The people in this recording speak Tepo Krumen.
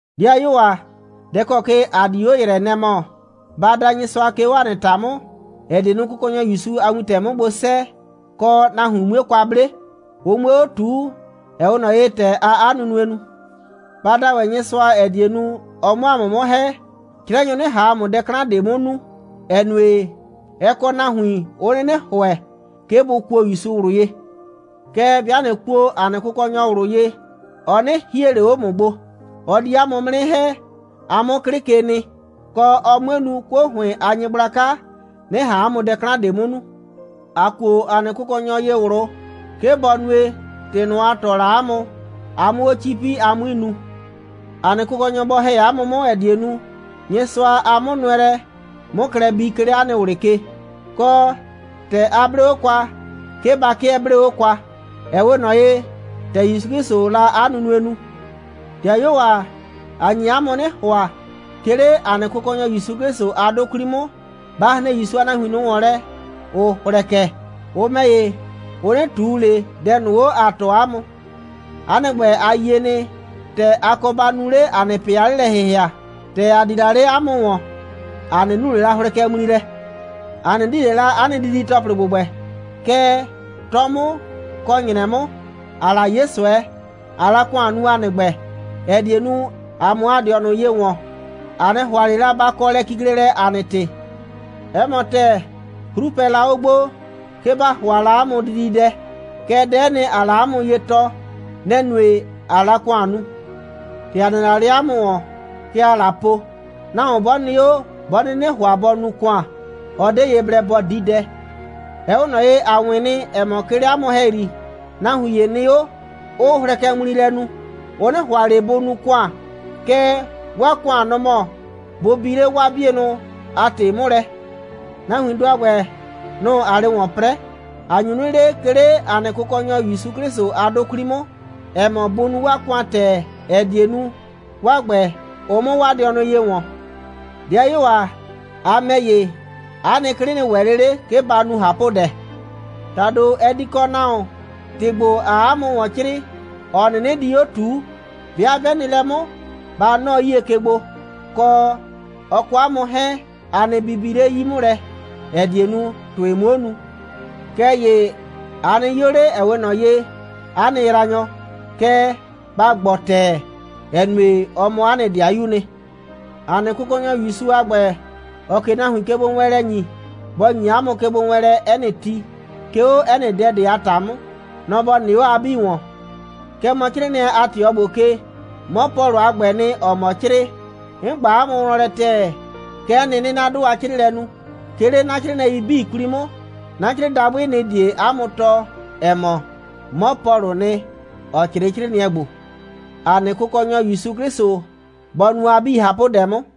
'Dɩayuo ‑a, dɛ ‑kɔ ke ‑a di 'o ‑yrɛɛ, nɛ‑ mɔ: ba da Nyɩsʋa, 'ke 'o ‑a nɩ ‑ta 'mʋ, ‑ɛ die nu, Kʋkɔnyɔ ‑Yusu a wintɛ 'mʋ gbo 'sɛɛ, kɔ, nahuin 'mue kwa 'ble, ʋ 'mue 'o ꞊tuu, ‑ɛ 'we ꞊nɔ ye, ‑tɛ aa 'a nunue nu. Ba da ‑wɛ Nyɩsʋa, ‑ɛ die nu, ɔ 'mʋ ‑a mʋ 'mʋ ‑hɛ, 'crɛnyʋ 'nɩ ꞊han ‑a mʋ dɛ 'klan ꞊de 'mʋ nu, ‑ɛ nue, ɛ kɔ nahuin, 'ʋ 'nɩnɩ ‑hʋɛ, 'ke bʋ kuo ‑Yusu ꞊wlʋ ye. Kɛɛ, 'bɩa ꞊nɩ kuo ‑a nɩ Kʋkɔnyɔ ꞊wlʋ ye, ɔ 'nɩ hie ꞊le 'o ‑mʋ gbo. Ɔ di 'a mʋ 'mʋ 'nɩ ‑hɛ, a 'mʋ 'klɩ ke nɩ, kɔ, ɔ 'mue nu, 'kuo ‑hʋɩn a nyɩgblaka 'nɩ ꞊han 'a mʋ dɛ 'klan ꞊de 'mʋ nu. ‑A kuo ‑a nɩ Kʋkɔnyɔ ye ꞊wlʋ, 'ke bɔ nue, ‑tɩ ꞊nʋ, ‑a tɔɔ la 'a mʋ, a 'mʋ 'o 'cipi, a 'mui nu. ‑A nɩ Kʋkɔnyɔ bɔ ‑hɛ 'a mʋ 'mʋ, ‑ɛ die nu, Nyɩsʋa a 'mʋnʋɛlɛ 'mʋ klɛ bii, 'ke 'le 'a nɩ ꞊wlɩ ke, kɔ, ‑tɛ a 'blee 'o kwa, 'ke ba 'kɩɛ 'blee 'o kwa, ‑ɛ 'we ꞊nɔ ye, ‑tɛ ‑Yusu 'Klɩsʋʋ la 'a nunue nu. 'Dɩayuo ‑a, ‑a nye 'a mʋ 'nɩ ‑hʋa, 'ke 'le ‑a nɩ Kʋkɔnyɔ ‑Yusu 'Klɩsʋ a 'dʋ 'kwli 'mʋ, ba hren ‑Yusu a nahuin ꞊nʋ ‑wɔn lɛ, ‑ʋ hlɛkɛ. Ʋ ‑mɛ ‑ye, ʋ 'nɩ ꞊tuu ꞊le dɛ ꞊nʋ 'o, ‑a tɔɔ 'a mʋ. 'A nɩ ‑gbɛ, a yie nɩ, ‑tɛ a kɔ ba nu 'le ‑a nɩ ꞊pɩ a 'lelɛ‑hɩhɩa. ‑Tɛ ‑a di la 'le 'a mʋ ‑wɔn, ‑a 'nɩ nu ꞊le la hlɛkɛŋmli lɛ. ‑A 'nɩ di ꞊le la 'a nɩ didi‑tɔplɩ ‑gbʋgbɛ. Kɛɛ, 'tɔ 'mʋ kɔ ‑nyrɛ 'mʋ, ‑aa la 'ye ꞊sʋɛ, ꞊aa la ‑kʋan nu, ‑a nɩ ‑gbɛ, ‑ɛ die nu, ‑a 'mʋ ‑a dɩɔnʋ ye ‑wɔn. ‑A 'nɩ ‑hʋa ꞊le la ba kɔ lɛkiklelɛ ‑a nɩ ‑tɩ. 'Ɛ mɔ ‑tɛɛ, 'hru pɛ la 'o gbo, 'ke ‑ba ‑hʋa la 'a mʋ dididɛ, kɛɛ, dɛ'ɛ nɩ, ‑aa la 'a mʋ ye tɔɔ, nɛ‑ nue, ꞊aa la ‑kʋan nu. ‑Tɛ ‑a nɩ la 'le 'a mʋ ‑wɔn, kɛ ‑aa la po: «Nahuon 'bɔ nɩ 'o, 'bɔ 'nɩnɩ ‑hʋa bɔ nu ‑kʋan, ɔ 'de ye blɛ bɔ di dɛ.» Ɛ 'we ꞊nɔ ye, ‑a 'wɩn nɩ, ‑ɛ mɔ, 'ke 'le 'a mʋ ‑hɛyri, nahuin ‑ye nɩ 'o, 'ʋʋ hlɛkɛŋmli lɛ nu. Ʋ 'nɩ ‑hʋa ꞊le bʋ nu ‑kʋan, kɛɛ, 'waa ‑kʋan, nɔ‑ mɔ bʋ bi 'le 'waa 'bienʋ a ‑tɩ 'mʋ lɛ. Nahuindʋ a ‑gbɛ, nʋ‑ ‑aa 'le ‑wɔn 'prɛɛ. ‑A nyu 'nɩ le, 'ke 'le ‑a nɩ Kʋkɔnyɔ ‑Yusu 'Klɩsʋ a 'dʋ 'kwli 'mʋ, ‑ɛ mɔ, bʋ nu 'waa ‑kʋan ‑tɛɛ, ‑ɛ die nu, 'waa ‑gbɛ, ʋ 'mʋ 'waa dɩɔnʋ ye ‑wɔn. 'Dɩayuo ‑a, a ‑mɛ ‑ye, 'a nɩ 'klɩ nɩ ‑wɛ 'le 'le, 'ke ba nu ꞊hapʋdɛ. ‑Tado, ɛ di kɔ nahuon, ‑tɩ ‑gbo, ‑aa 'a mʋ ‑wɔn 'crɩɩ, ‑ɔ 'nɩnɩ di 'o ꞊tuu. 'Bɩa 'bɛ nɩ lɛ 'mʋ, ba 'nɔɔ 'yie ke gbo, kɔ, ɔ kɔ 'a mʋ 'hɛɛn, a nɩ bibi 'le 'yi 'mʋ lɛ, ‑ɛ die nu, ‑tʋɩ 'muo nu. Kɛɛ ‑ye a nɩ 'yo 'le, ‑ɛ 'we ꞊nɔ ye 'a nɩ yraanyɔ, kɛɛ, ba ‑gbɔɔ ‑tɛɛ, ‑ɛ nue, ɔ mɔ 'a nɩ 'dɩayuu 'nɩ. ‑A nɩ Kʋkɔnyɔ ‑Yusu a ‑gbɛ, ‑ɔɔ ꞊ke nahuin kegbowɛɛnlɛ ‑nyi, bɔ ‑nyi 'a mʋ kegbowɛɛnlɛ 'ɛ nɩ ti, 'ke 'o 'ɛ nɩ dɛ ꞊de a ‑ta 'mʋ. Nɔ‑ ‑bɔ nɩ 'o a 'bii ‑wɔn. Kɛ mɔ 'crɩɩnɩɛ a ꞊tɩɔ ‑gbo ke, 'mɔ Pɔlʋ a ‑gbɛɛ nɩ, ‑ɔɔ mɔ 'crɩɩ. 'N ꞊gba 'a mʋ wlɔn lɛ ‑tɛɛ. Kɛ'ɛ nɩ, 'nɩɩ 'na 'dʋ a 'crɩɩlɛ nu, 'ke 'le 'na 'crɩɩnɩɛi 'bii 'kwli 'mʋ. 'Na 'crɩɩdabʋɩ, nɩ‑ die 'a mʋ tɔɔ, ‑ɛ mɔ, 'mɔ Pɔlʋʋ nɩ, ‑ɔ 'crɩɩ 'crɩɩnɩɛ ‑gbo. ‑A nɩ Kʋkɔnyɔ ‑Yusu 'Klɩsʋ bɔ nu a 'bii ꞊hapʋdɛ 'mʋ.